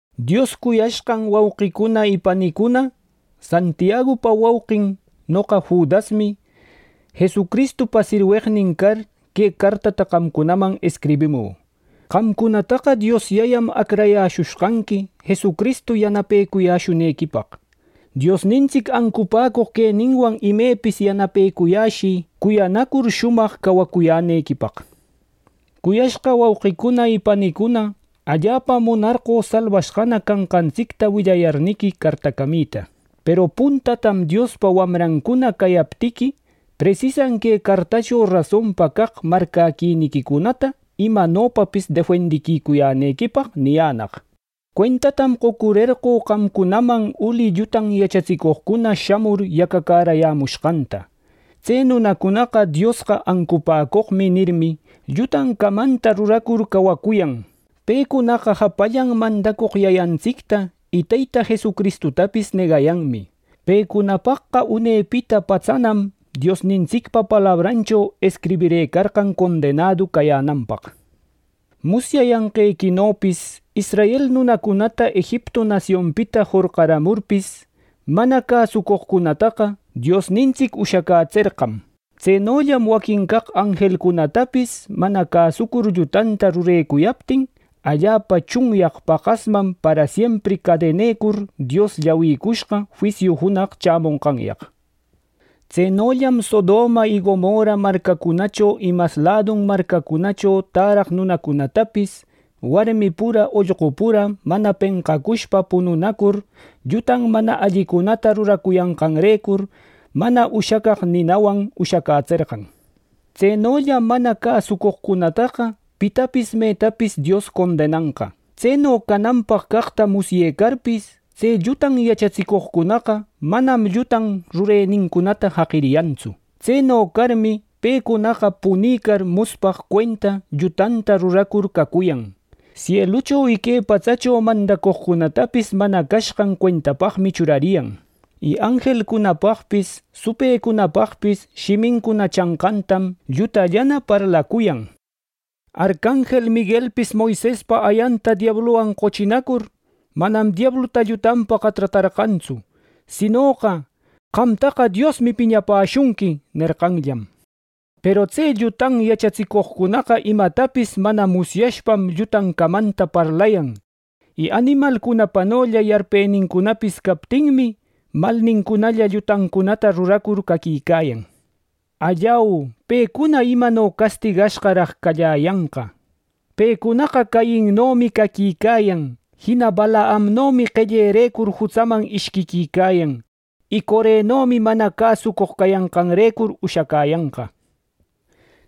Dios cuyashqan wauqicuna y panicuna, Santiagupa wauqin, noqa Judasmi, Jesucristupa sirweqnin car, que cartata qamcunaman escribimü. Qamcunataqa Dios Yayam acrayäshushqanqui Jesucristu yanapecuyäshunequipaq. Diosnintsic ancupäcoq queninwan imepis yanapecuyäshï cuyanacur shumaq cawacuyänequipaq. Cuyashqa wauqicuna y panicuna, allapam munarqö salbashqana canqantsicta willayarniqui cartacamita. Peru puntatam Diospa wamrancuna cayaptiqui, presisan que cartächo rasonpa caq marcäquiniquicunata imecanopapis defendicuyänequipaq niyänaq. Cuentatam qocurerqö qamcunaman uli llutan yachatsicoqcuna shamur yacacärayämushqanta. Tse nunacunaqa “Diosqa ancupäcoqmi” nirmi, llutan camanta ruracur cawacuyan. Pecunaqa japallan mandacoq Yayantsicta y Teyta Jesucristutapis negayanmi. Pecunapaqqa unepita patsanam Diosnintsicpa palabranchopis escribirëcan condenädu cayänanpaq. Musyayanqequinopis israel nunacunata Egiptu nasionpita jorqacamurpis, mana cäsucoqcunataqa Diosnintsic ushacätserqam. Tsenollam waquin caq anjelcunatapis mana cäsucur llutanta rurecuyaptin, allapa tsunyaq paqasman parasiempri cadenarcur Dios llawircushqa juisiu junaq chämonqanyaq. Tsenollam Sodoma y Gomorra marcacunacho y mas ladun marcacunacho täraq nunacunatapis, warmi pura, ollqu pura mana penqacushpa pununacur, lluta mana allicunata rurayanqanrecur, mana ushacaq ninawan ushacätserqan. Tsenollam mana cäsucoqcunataqa pitapis metapis Dios condenanqa. Tseno cananpaq caqta musyecarpis, tse llutan yachatsicoqcunaqa manam llutan rurenincunata jaqiyantsu. Tseno carmi, pecunaqa punicar nuspaq cuenta llutata ruracur cacuyan. Sielucho y que patsacho mandacoqcunatapis mana cashqan cuentapaqmi churariyan. Y anjelcunapaqpis supëcunapaqpis shimincuna chanqantam llutallana parlacuyan. Arcanjel Miguelpis Moisespa ayanta diabluwan qochinacur, manam diabluta llutanpaqa tratarqantsu; sinoqa, “¡Qamtaqa Diosmi piñapäshunqui!” nerqanllam. Peru tse llutan yachatsicoqcunaqa imatapis mana musyashpam llutan camanta parlayan; y animalcunapanolla yarpenincunapis, captinmi malnincunalla llutancunata ruracur caquicayan. ¡Allau, pecuna imano castigashqaraq calläyanqa! Pecunaqa Cainnomi caquicayan. Jina Balaamnomi qellepaqrecur jutsaman ishquiquicayan. Y Corenomi mana cäsucoq cayanqanrecur ushacäyanqa.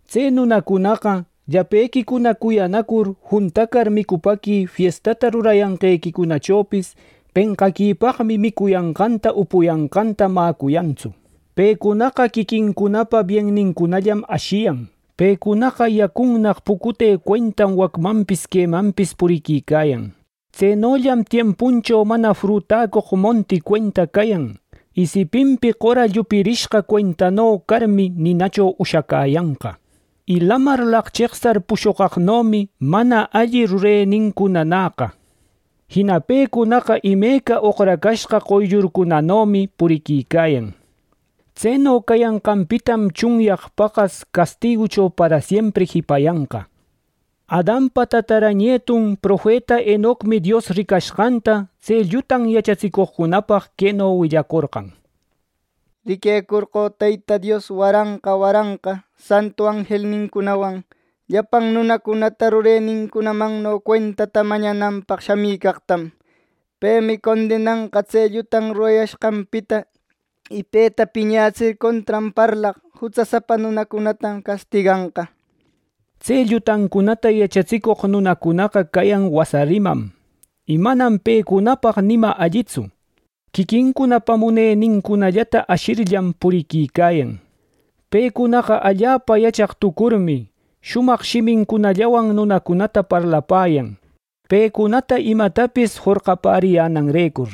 Tse nunacunaqa, llapequicuna cuyanacur juntacar micupäqui fiesta rurayanqequichopis penqaquipaqmi micuyanqanta upuyanqanta mäcuyantsu. Pecunaqa quiquincunapa biennincunallam ashiyan. Pecunaqa yacunnaq pucute cuentam wacmanpis quemanpis puriquicayan. Tsenollam tiempuncho mana frutacoq monti cuenta cayan, y sipintin qora llupirishqa tsaquishqano carmi ninacho ushacäyanqa. Y lamar laqcheqsar pushoqaqnomi mana alli rurenincunanäqa. Jina pecunaqa imeca oqracashqa qoyllurcunanomi puriquicayan. Tseno cayanqanpitam tsunyaq paqas castigucho parasiempri jipayanqa. Adanpa tatara nietun profeta Enocmi Dios ricashqanta tse llutan yachatsicoqcunapaq queno willacorqan: “Riquecorqö Teyta Dios waranqa waranqa santu anjelnincunawan llapan nunacunata rurenincunamanno cuentata mañananpaq shamïcaqtam. Pemi condenanqa tse llutan rurayashqanpita. Y peta piñatsir, contran parlaq jutsasapa nunacunata castiganqa” nir. Tse llutancunata yachatsicoq nunacunaqa cayan wasa rimam, y manam pecunapaq ni ima allitsu. Quiquincunapa munenincunallata ashirllam puriquicayan. Pecunaqa allapa yachaq tucurninmi, shumaq shimincunallawan nunacunata parlapäyan, pecunata imatapis jorqapäriyänanrecur.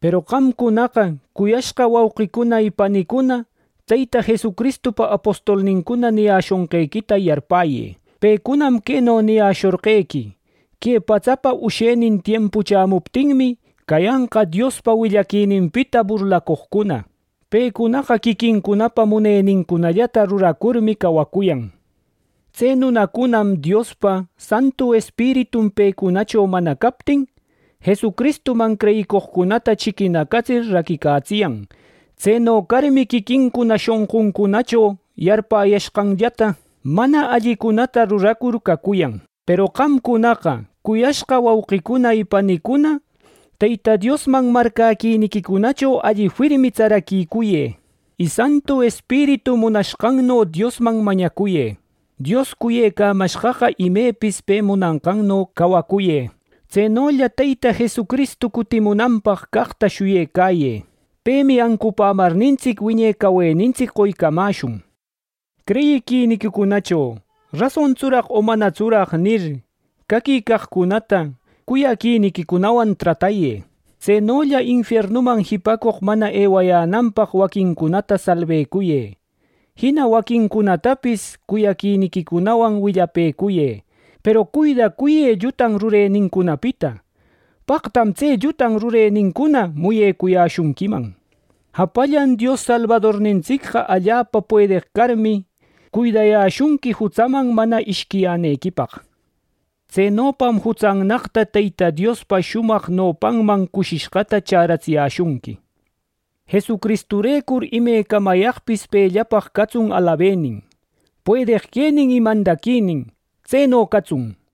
Peru qamcunaqa, cuyashqa wauqicuna y panicuna, Teyta Jesucristupa apostolnincuna niyäshonqequita yarpäyë. Pecunam queno niyäshorqequi: “Que patsapa ushaquenin tiempu chämuptinmi, cayanqa Diospa willapäquininpita burlacoqcuna. Pecunaqa quiquincunapa munenincunallata ruracurmi cawacuyan” nir. Tse nunacunam Diospa Santu Espiritun pecunacho mana captin, Jesucristuman creyicoqcunata chiquinacatsir raquicatsiyan; tseno carmi quiquincuna shonquncunacho yarpäyashqanllata mana allicunata ruracur cacuyan. Peru qamcunaqa, cuyashqa wauqicuna y panicuna, Teyta Diosman marcäquiniquicunacho alli firmi tsaraquicuyë. Y Santu Espiritu munashqanno Diosman mañacuyë. Dios cuyecamashqaqa imepis pe munanqanno cawacuyë. Tsenolla Teyta Jesucristu cutimunanpaq caqta shuyecayë. Pemi ancupämarnintsic wiñe cawenintsic qoycamäshun. Creyiquinincunacho “¿Rasontsuraq o manatsuraq?” nir, caquicaqcunata cuyaquiniquicunawan tratayë. Tsenolla infiernuman jipacoq mana ewayänanpaq waquincunata salbecuyë, jina waquincunatapis cuyaquiniquicunawan willapëcuyë; peru cuidacuyë lluta rurenincunapita. ¡Paqtam tse lluta rurenincuna muyecuyäshunquiman! Japallan Dios Salbadornintsicqa allapa puedeq carmi, cuidayäshunqui jutsaman mana ishquiyänequipaq. Tsenopam jutsannaqta Teyta Diospa shumaq nopanman cushishqata chäratsiyäshunqui. Jesucristurecur imecamayaqpis pellapaq catsun alabenin, puedeq quenin y mandaquinin. Tseno catsun.